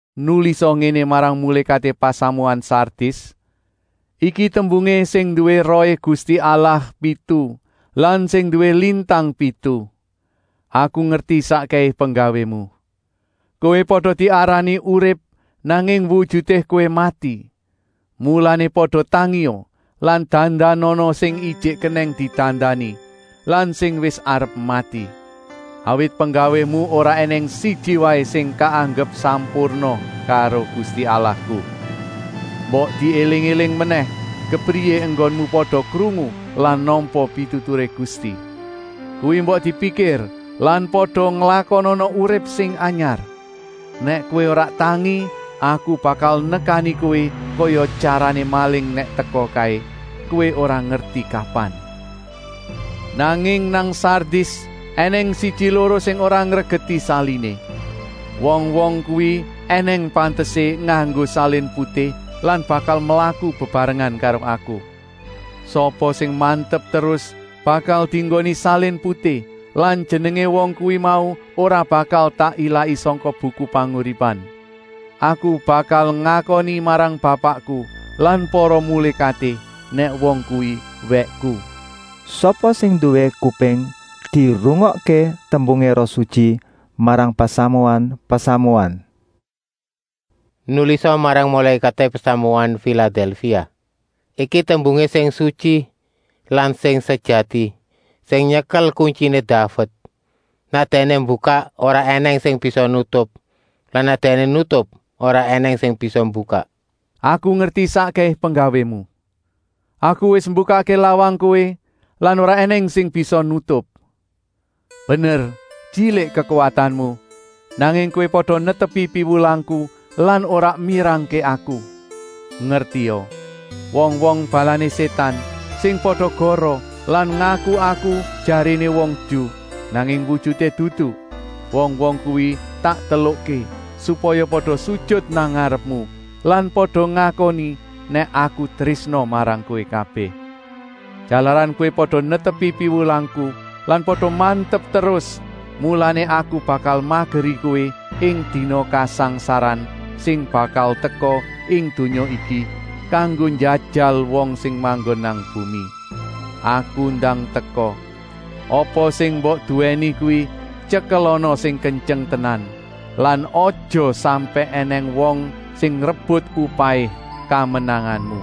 “Nulisa ngéné marang mulékaté pasamuan Sardis: Iki tembungé sing nduwé Rohé Gusti Allah pitu lan sing nduwé lintang pitu: Aku ngerti sakkèhé penggawému. Kowé pada diarani urip, nanging wujuté kowé mati. Mulané pada tangia lan dandanana sing ijik kenèng didandani lan sing wis arep mati. Awit penggawému ora ènèng siji waé sing kaanggep sampurna karo Gusti Allahku. Mbok diéling-éling menèh kepriyé enggonmu pada krungu lan nampa pituturé Gusti. Kuwi mbok dipikir lan pada nglakonana urip sing anyar. Nèk kowé ora tangi, Aku bakal nekani kowé kaya tyarané maling nèk teka kaé, kowé ora ngerti kapan. Nanging nang Sardis ènèng siji-loro sing ora ngregeti saliné. Wong-wong kuwi ènèng pantesé nganggo salin putih lan bakal mlaku bebarengan karo Aku. Sapa sing mantep terus bakal dienggoni salin putih lan jenengé wong kuwi mau ora bakal tak ilaki sangka buku panguripan. Aku malah bakal ngakoni marang Bapakku lan para mulékaté, nèk wong kuwi wèkku. “Sapa sing nduwé kuping, dirungokké tembungé Roh Sutyi marang pasamuan-pasamuan. “Nulisa marang mulékaté pasamuan Filadèlfia: Iki tembungé Sing Sutyi lan Sing Sejati, sing nyekel kuntyiné Daved. Nèk Dèkné mbukak, ora ènèng sing bisa nutup lan nèk Dèkné nutup, ora ènèng sing bisa mbukak: Aku ngerti sakkèhé penggawému. Aku wis mbukakké lawang kowé lan ora ènèng sing bisa nutup. Bener tyilik kekuwatanmu, nanging kowé pada netepi piwulangku lan ora mirangké Aku. Ngertia, wong-wong balané Sétan, sing pada goroh lan ngaku-aku jaréné wong Ju, nanging wujuté dudu, wong-wong kuwi tak telukké supaya pada sujut nang ngarepmu lan pada ngakoni nèk Aku trésna marang kowé kabèh. Jalaran kowé pada netepi piwulangku lan pada mantep terus, mulané Aku bakal mageri kowé ing dina kasangsaran sing bakal teka ing donya iki, kanggo njajal wong sing manggon nang bumi. Aku ndang teka. Apa sing mbok duwèni kuwi tyekelana sing kentyeng tenan lan aja sampèk ènèng wong sing ngrebut upahé kamenanganmu.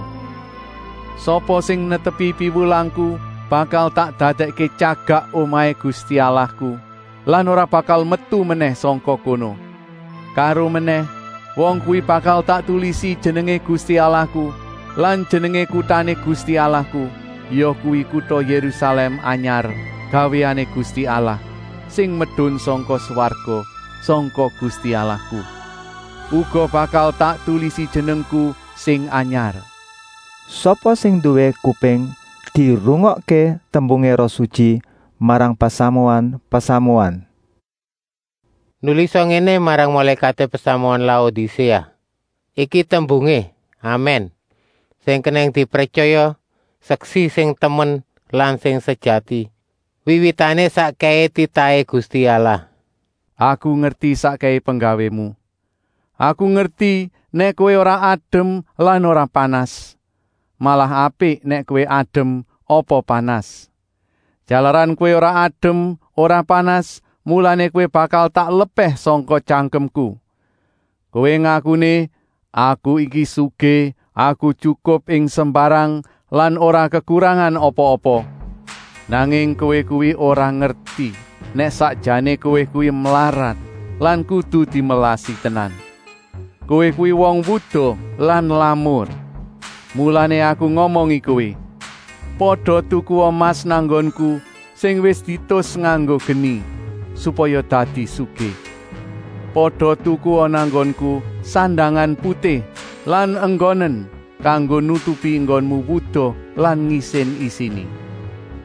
Sapa sing netepi piwulangku bakal tak dadèkké tyagak omahé Gusti Allahku lan ora bakal metu menèh sangka kono. Karomenèh wong kuwi bakal tak tulisi jenengé Gusti Allahku lan jenengé kutané Gusti Allahku, yakuwi kuta Yérusalèm anyar gawéané Gusti Allah, sing medun sangka swarga, sangka Gusti Allahku. Uga bakal tak tulisi jenengku sing anyar. “Sapa sing nduwé kuping, dirungokké tembungé Roh Sutyi marang pasamuan-pasamuan. “Nulisa ngéné marang mulékaté pasamuan Laodiséa: Iki tembungé Amèn, sing kenèng dipretyaya, seksi sing temen lan sejati, wiwitané sakkèhé titahé Gusti Allah: “Aku ngerti sakkèhé penggawému. Aku ngerti nèk kowé ora adem lan ora panas. Malah apik nèk kowé adem apa panas. Jalaran kowé ora adem ora panas, mulané kowé bakal tak lepèh sangka tyangkemku. Kowé ngakuné: Aku iki sugih, aku tyukup ing sembarang lan ora kekurangan apa-apa. Nanging kowé kuwi ora ngerti nèk sakjané kowé kuwi mlarat lan kudu dimelasi tenan. Kowé kuwi wong wuda lan lamur. Mulané Aku ngomongi kowé: pada tukua emas nang nggonku, sing wis dietus nganggo geni, supaya dadi sugih. Pada tukua nang nggonku sandangan putih lan enggonen, kanggo nutupi enggonmu wuda lan ngisin-isini.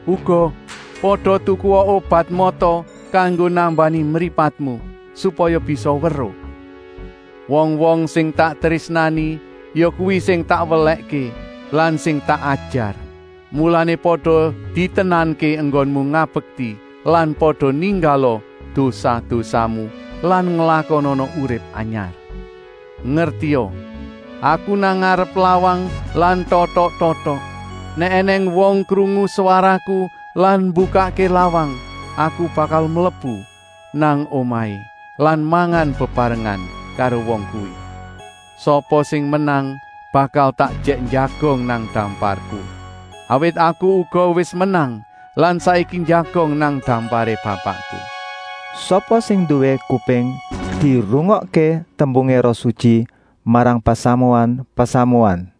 Uga, pada tukua obat mata kanggo nambani mripatmu, supaya bisa weruh. Wong-wong sing tak trésnani, yakuwi sing tak welèkké lan sing tak ajar. Mulané pada ditenanké enggonmu ngabekti lan pada ninggala dosa-dosamu lan nglakonana urip anyar. Ngertia! Aku nang ngarep lawang lan totok-totok. Nèk ènèng wong krungu swaraku lan mbukakké lawang, Aku bakal mlebu nang omahé lan mangan bebarengan karo wong kuwi. Sapa sing menang bakal tak ejèk njagong nang damparku. Awit Aku uga wis menang lan saiki njagong nang damparé Bapakku. “Sapa sing nduwé kuping, dirungokké tembungé Roh Sutyi marang pasamuan-pasamuan.”